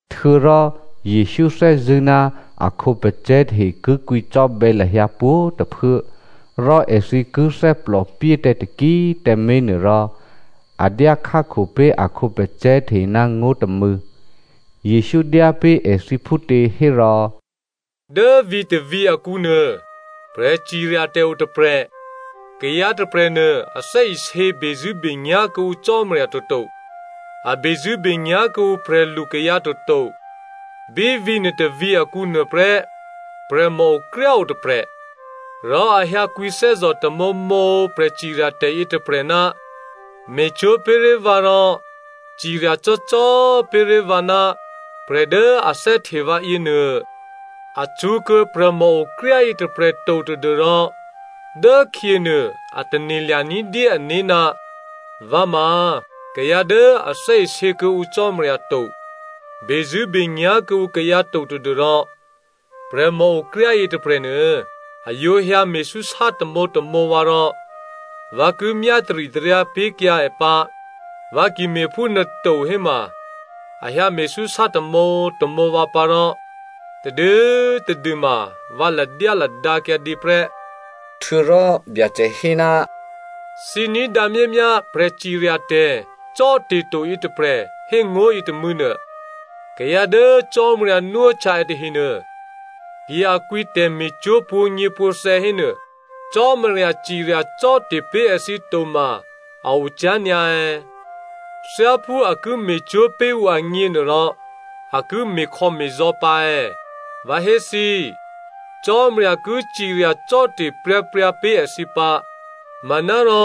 Htuô̌rò Jesǔ thè́zṳ̂́ ná a khǒpacè̤̌ tahe ki kwǐcò́bè̌ lahyǎ pwǒ̤꤮ tôphuố, rò èthǐ ki thè́plòpyé tǎ taki꤮ tǎmé̤ nuôrò, a dyákhákho pé̤ a khǒpacè̤̌ tahe ná ngó̤ tômû̌. Jesǔ dyá pé̤ èthǐ phútě hérò, “Dố vǐ̤tôvǐ̤ akǔnuô, prè̤ciryatè̤ otôprè̤. Kayǎ tôprè̤nuô a thè́isě bezṳ̂́benyá̤ kuô̌ǔ Cò́marya toto, a bezṳ̂́benyá̤ kuô̌ǔ prè̤lu kayǎ toto. Bí vǐ̤ nuôtôvǐ̤ akǔ nuôprè́, prè̤mòokryá o tôprè̤. Rò a hyǎ kwǐthè́zò̤ tamǒmǒ prè̤ciryatè̤ yětôprè̤, ‘Me̤cwó̤ pé̤ré̤ vǎ rò ciryacò́cò́ pé̤ré̤ vǎ ná prè̤ dố a thè́hte vǎ yěnuô.’ “A cṳ̌kuô̌ prè̤mòokryá yětôprè̤ to tadû́rò dốkhyěnuô a tane̤lya̤ ní̤dyé ané̤, ‘Vǎ ma kayǎ dố a thè́isě kuô̌ǔ Cò́marya to, bezṳ̂́benyá̤ kuô̌ǔ kayǎ to tadû́rò, prè̤mòokryá yětôprè̤nuô, a yǒ hyǎme̤súsá tamǒtamǒ vǎ rò vǎ ki myá taritaryǎ pé̤kyǎ è pǎ. Vǎ ki me̤phúnuô to héma, a hyǎ me̤súsá tamǒtamǒ vǎ pǎ rò tadû꤮ tadû ma vǎ ladyáladǎ kyǎdě prè́.’” Htuô̌rò Byacè hé, “Thǐ ní̤dǎ myámyá prè̤ciryatè̤ cò́te̤to yětôprè̤ hé ngó̤ yětômû̌ nuô. Kayǎ dố Cò́marya nwóhtya è tahenuô, ki a kwǐ tè̤me̤cwó̤ pwǒ̤nyěpwǒ̤thè̌ hénuô, Cò́marya cirya cò́te̤ pé̤ èthǐ toma a ocyá̤ nyǎ è̌? Thyáphú a ki me̤cwó̤ pé̤ ǔ agně nuôrò a ki me̤khò̌me̤zò̌ pǎ è̌? Vǎ hé thǐ, Cò́marya ki cirya cò́te̤ pryǎpryǎ pé̤ èthǐ pǎ. Manárò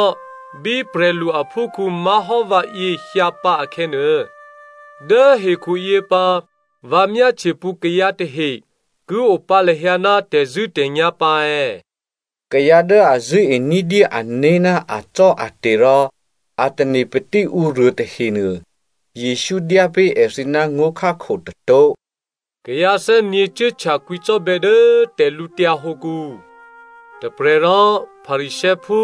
bí prè̤lu aphúkhǔ má̤hò́ vǎyě hyǎ pǎ akhè̌nuô, dố hekhuyě pǎ vǎ myáhtye pǔ kayǎ tahe ki opǎ lahyǎ ná tè̤zṳ̂́tè̤nyá̤ pǎ è̌?” Kayǎ dố a zṳ̂́e ní̤dyé ané̤ ná acò́ate̤ rò a tane̤patí ǔruô tahenuô, Jesǔ dyá pé̤ èthǐ ná ngó̤khákho tôtó̤. “Kayǎ thè́nyě̤ cuốhtya kwǐcò́bè̌ dố tè̤lǔtyǎ hǒkǔ. Tôprè̤ rò Pharisěophú,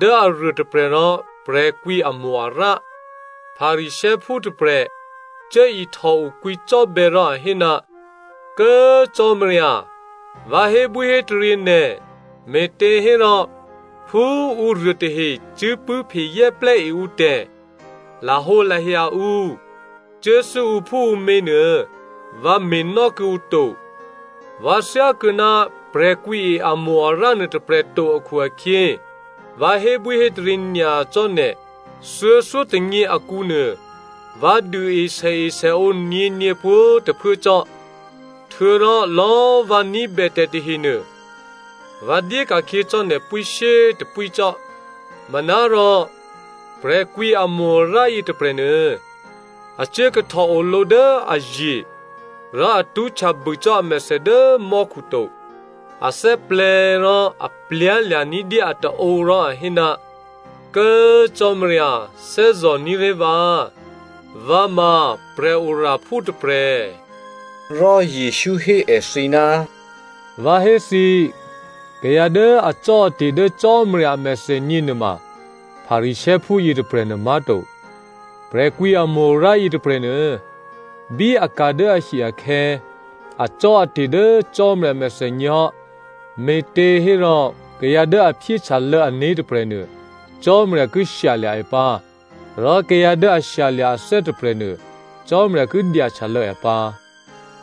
dố aruôtôprè̤ rò prè̤kwǐamo-arǎ. Pharisěophú tôprè̤ cuố ihtòo kwǐcò́bè̌ rò a hé, ‘Kố꤮ Cò́marya, vǎ hébwíhétaryě nè̤, me̤těhérò phú ǔruô tahe cuốpṳ̂́phe zè́plè́ e ǔtè̤, lahǒlahya ǔ, cuốthû́ ǔphúǔmě nuô vǎ me̤nò́ kuô̌ǔ to. Vǎ thyákuô̌ ná prè̤kwǐe amo-arǎ nuôtôprè̤ to akhu-akhyě vǎ hébwíhétaryě nyacò́ nè̤. Thuô̌thyótônyě akǔnuô, vǎ duôe sèesèǒ nyě̤nyě pwǒ̤꤮ tôphuố cò́, htuô̌rò lò̌꤮ vǎ ní̤bè tè̤ tahenuô, vǎ dyé ka̤khyě cò́ nè̤ pwíshyétôpwí cò́.’ “Manárò prè̤kwǐamo-arǎ yětôprè̤nuô, a cuốkahtòo lǒ dố aye̤, rò a tṳ́htya bû cò́ amèthè dố mò́khu to. A thè́plè̤̌ rò a htòlya̤ ní̤dyé ataǒ rò a hé, ‘Kố꤮ Cò́marya꤮ thè́zò̤ní̤ré̤ vǎ. Vǎ ma prè̤oraphú tôprè̤.’” Rò Jesǔ hé èthǐ, “Vǎ hé thǐ, kayǎ dố acò́ate̤ dố Cò́marya a mèthènyě nuôma Pharisěophú yětôprè̤nuô má̤to. Prè̤kwǐamo-arǎ yětôprè̤nuô, bí a ka̤ dố ahi akhè̌, acò́ate̤ dố Cò́marya a mèthènyě hò́, me̤těhérò kayǎ dố a phyéhtyalô̌ ané̤ tôprè̤nuô, Cò́marya ki shyalya̤ è pǎ rò kayǎ dố ashyalya̤-athè́ tôprè̤nuô, Cò́marya ki dyahtyalô̌ è pǎ.”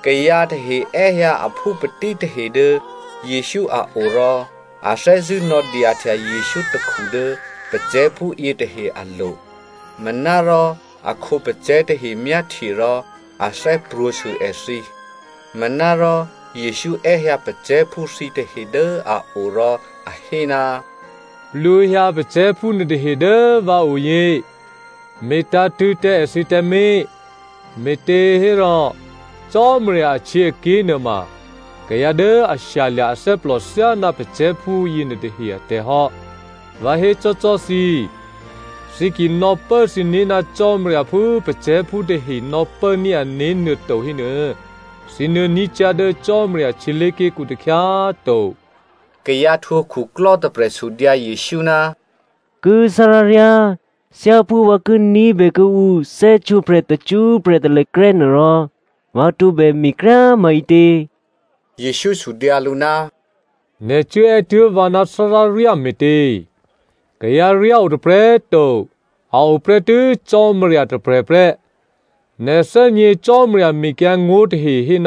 Kayǎ tahe è́hyǎ aphúpatí tahe dố Jesǔ a o rò a thè́zṳ̂́ nò̌dyahtya Jesǔ takhu dố pacè̤̌phú yětahe alo̤, manárò a khǒpacè̤̌ tahe myáhtye rò a thè́prwǒ̤sû èthǐ. Manárò Jesǔ è́hyǎ pacè̤̌phú thǐtahe dố a o rò a hé, “Plwǒhyǎ pacè̤̌phú nuôtahe dố vǎoyě, me̤tǎ̤tṳ̂̌ tǎ èthǐ tǎmé̤, me̤těhérò Cò́marya ahtyěaké̤ nuôma kayǎ dố a shyalya̤ athè́plò thyáná pacè̤̌phú yěnuôtahe atè̤hò́. Vǎ hécò́cò́ thǐ, thǐ ki nò̌pố thǐné̤ ná Cò́marya phú pacè̤̌phú tahe nò̌pốní̤ ané̤ nuôto hénuô, thǐ nuô̌ ní̤ cyá̤ dố Cò́marya htyělé̤ké̤kǔ takhyá꤮ to.” Kayǎ htwǒ khuklò́ tôprè̤ sudyǎ Jesǔ, “Kố꤮ tháráryá꤮ thyáphú vǎ ki ní̤bè kuô̌ǔ thè́htwǒprè̤ tacṳ́prè̤ talèkrè́ nuôrò, vǎ tǒbè me̤kryá꤮ maǐtě?” Jesǔ sudyǎ lǔ, “Nè̤ cuốè́ tuố̤ vǎ ná tháráryá me̤tě? Kayǎryá o tôprè̤꤮ to, a o prè́tû́ Cò́marya tôprè̤prè́. Nè̤ thè́gně Cò́marya mekyǎngó̤ tahe hé,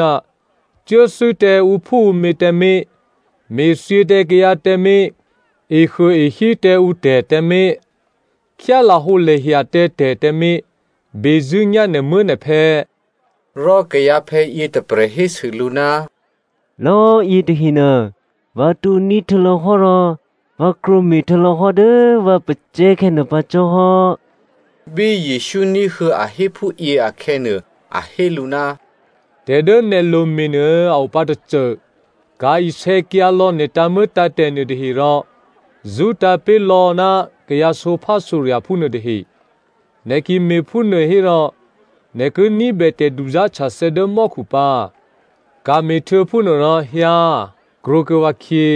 ‘Cuốthû́ tǎ ǔphúǔmě tǎmé̤, me̤thyě tǎ kayǎ tǎmé̤, ehuôehí tǎ ǔtè̤ tǎmé̤, khyá lahǒlahya tǎ tè̤ tǎmé̤, bezṳ̂́nyá̤ nè̤muố̤nè̤phè̌.’” Rò kayǎphè̌ yětôprè̤ hésû lǔ, “Lò̌꤮ yětahenuô vǎ tǒ̤ní̤ htuô̌lò̌hò́ rò vǎ krwǒme̤ htuô̌lò̌hò́ dố vǎ pacè̤̌khè̌ nuô pǎ cò́hò́.” Bí Jesǔ ní̤huô̌ a hé phúyě akhè̌nuô, a hé lǔ, “Tè̤ dố nè̤ lome̤ nuô a opǎ tôcô, ka̤ isè̌kyǎlò̌ nè̤ tǎ̤muô̌tǎ̤tè̤ nuôtahe rò zṳ́tǎ̤ pé̤ lò̌ ná kayǎ sǒphásǒrya̤phú nuôtahe. Nè̤ ki me̤phúnuô hérò nè̤ ki ní̤bè tè̤duzá̤htyathè̌ dố mò́khu pǎ. Ka̤me̤htuô̌ phúnuô rò hyǎ krwǒkuô̌ vǎkhyě.”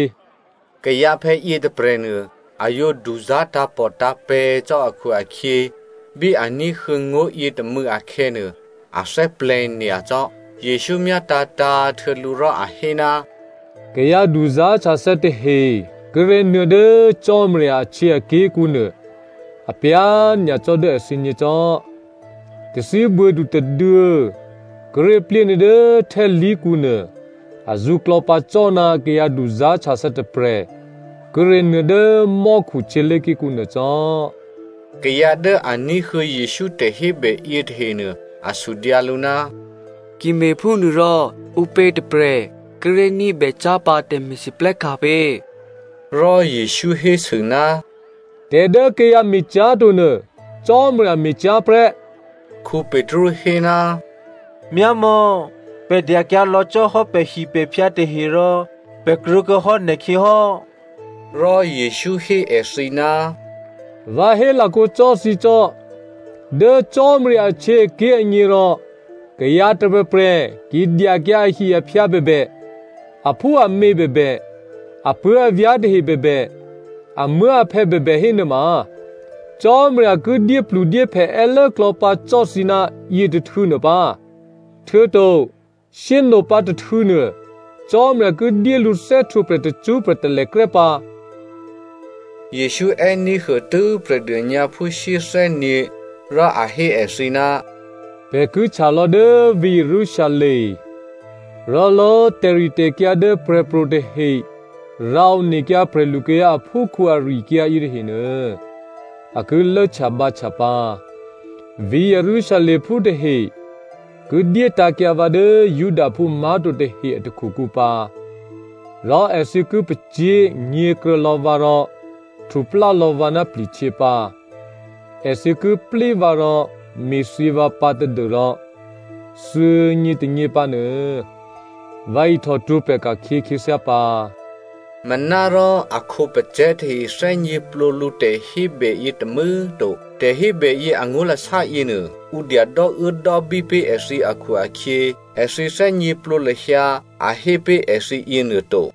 Kayǎphè̌ yětôprè̤nuô, a yǒ duzá̤ tǎ̤pòtǎ̤pè̤̌ cò́ akhu-akhyě bí a ní̤huô̌ ngó̤ yětômû̌ akhè̌nuô, a thè́plè̤̌ nyacò́. Jesǔ myátǎ̤tǎ̤꤮ htuô̌ lǔ rò a hé, “Kayǎ duzá̤htyathè̌ tahe kíré̤ nuô̌ dố Cò́marya ahtyěaké̤kǔ nuô, apyá̤ nyacò́ dố èthǐgně cò́! Tathíbuô̌du tôduô̌ kíré̤ plyénuô̌ dố htè́khǎlí̤kǔnuô azǔ klò̌pǎ cò́ ná kayǎ duzá̤htyathè̌ tôprè̤ kíré̤ nuô̌ dố mò́khu htyělé̤ké̤kǔ nuô cò́.” Kayǎ dố a ní̤huô̌ Jesǔ tè̤hébè yětahenuô, a sudyǎ lǔ, “Ki me̤phúnuôrò ǔpě tôprè̤ kíré̤ ní̤bè cyá̤pǎ tè̤me̤lwóhteka̤ pě?” Rò Jesǔ hésû, “Tè̤ dố kayǎ me̤cyá̤tonuô, Cò́marya me̤cyá̤ prè́.” Petru hé, “Myámò̌, pè̤ dyakyǎ lò̌ cò́ hò́ pè̤hipè̤phyǎ tahe rò pè̤ krwǒkuô̌hò́ nè̤khyě hò́.” Rò Jesǔ hé èthǐ, “Vǎ hélakǒ cò́ thǐ cò́, dố Cò́marya ahtyěaké̤ agněrò, kayǎ tôprè̤prè̤ ki dyakyǎ ahi-aphyǎ bèbè, aphúamě bèbè, apuố̤avyá̤ tahe bèbè, amuố̤aphè̌ bèbè hénuôma, Cò́marya ki dyépludyéphè è́lốklò̌ pǎ cò́ thǐ ná yětôhtû̌nuô pǎ, htuô̌to shyé꤮ nopǎ tôhtû̌nuô, Cò́marya ki dyé lǔ thè́htwǒprè̤ tacṳ́prè̤ talèkrè́ pǎ.” Jesǔ è́ní̤huô tû́ prè̤dônyǎphú shyéthè́nyě̤, rò a hé èthǐ, “Pè̤ ki htya lò̌ dố vǐ̤ Jerusalem. Rò lò̌꤮ tè̤ritè̤kyǎ dố prè̤pro̤ tahe rǎ onekyǎ prè̤lukayǎ aphúkhǔ ari-akyǎ yětahenuô, a ki lốhtyabǎhtya pǎ. Vǐ̤ Jerusalemphú tahe ki dyétǎ̤kyǎ vǎ dố Judaphú má̤to tahe a takhukǔ pǎ, rò èthǐ ki pacyé̤ nyě̤kruô̌ lò̌ vǎ rò htuplá lò̌ vǎ ná pli̤htyě pǎ. Èthǐ ki plí vǎ rò me̤thyě vǎ pǎ tadû́rò thuô̌nyě tônyě pǎ nuô, vǎ ihtòhtwǒprè̤ ka̤khyě khyěthyá pǎ.” Manárò a khǒpacè̤̌ tahe thè́gněplǒ lǔ tè̤hébè yětômû̌꤮ to. Tè̤hébèyě angó̤lasá yěnuô, ǔ dya dò́uốdò́bí pé̤ èthǐ akhu-akhyě, èthǐ thè́gněplǒ lahyǎ a hé pé̤ èthǐ yěnuô to.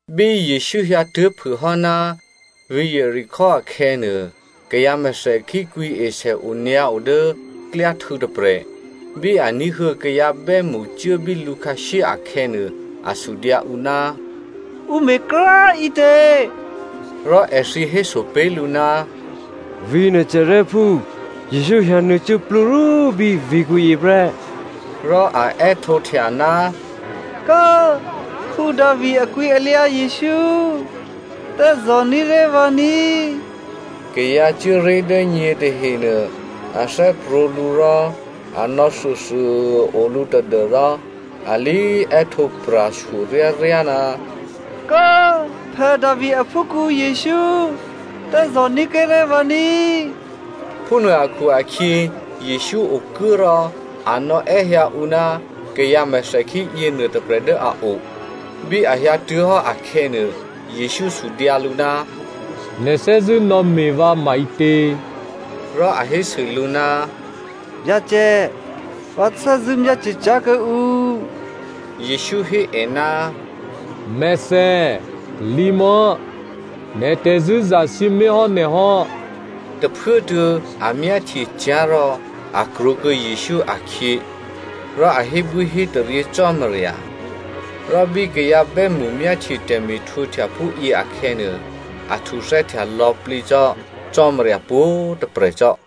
Bí Jesǔ hyǎtuố̤phûhò́ ná vǐ̤ Jeriko akhè̌nuô, kayǎ mèthèkhí kwǐesè onyǎo dố klyáhtû̌ tôprè̤. Bí a ní̤huô̌ kayǎ bè́mṳ cuố bí lǔkhǎshyé akhè̌nuô, a sudyǎ ǔ, “Ǔ me̤ kryá꤮ ǐtě?” Rò èthǐ héso pé̤ lǔ, “Vǐ̤ Nazarèphú Jesǔ hyǎnuô̌ cuốplúrwó bí vǐ̤kǔyě prè́.” Rò a è́htǒhtya, “Kố꤮ Davi aklwǐalyǎ Jesǔ꤮ thè́zò̤ní̤ré̤ vǎ ní!” Kayǎ cuố ré̤ dố nyě tahenuô a thè́prwǒ̤ lǔ rò, a nò̌ thuôthuô꤮ o lǔ tadû́rò a lé è́htǒ pra̤shyo ryáryá, “Kố꤮ Davi aphúkhǔ Jesǔ, thè́zò̤ní̤ kuô̌ré̤ vǎ ní꤮.” Phúnuô akhu-akhyě, Jesǔ okuố rò a nò̌è́hyǎ ǔ ná kayǎ mèthèkhí yěnuô tôprè̤ dố a o. Bí a hyǎtuố̤hò́ akhè̌nuô, Jesǔ sudyǎ lǔ, “Nè̤ thè́zṳ̂́ nò̌me̤ vǎ maǐtě?” Rò a hésû lǔ, “Byacè, vǎ thè́zṳ̂́ myáhtye cyá̤ kuô̌ǔ.” Jesǔ hé è, “Mèthè, lǐ mò̌꤮. Nè̤ tè̤zṳ̂́ zasǐmé̤hò́ nè̤ hò́.” Tôphuốtuô̌ a myáhtye cyá̤ rò a krwǒkuô̌ Jesǔ akhyě, rò a hébwíhétaryě Cò́marya. Rò bí kayǎ bè́mṳ myáhtye tè̤me̤htwǒhtya phúyě akhè̌nuô, a htuthè́htya lò̌plǐ cò́ Cò́marya pwǒ̤꤮ tôprè̤ cò́.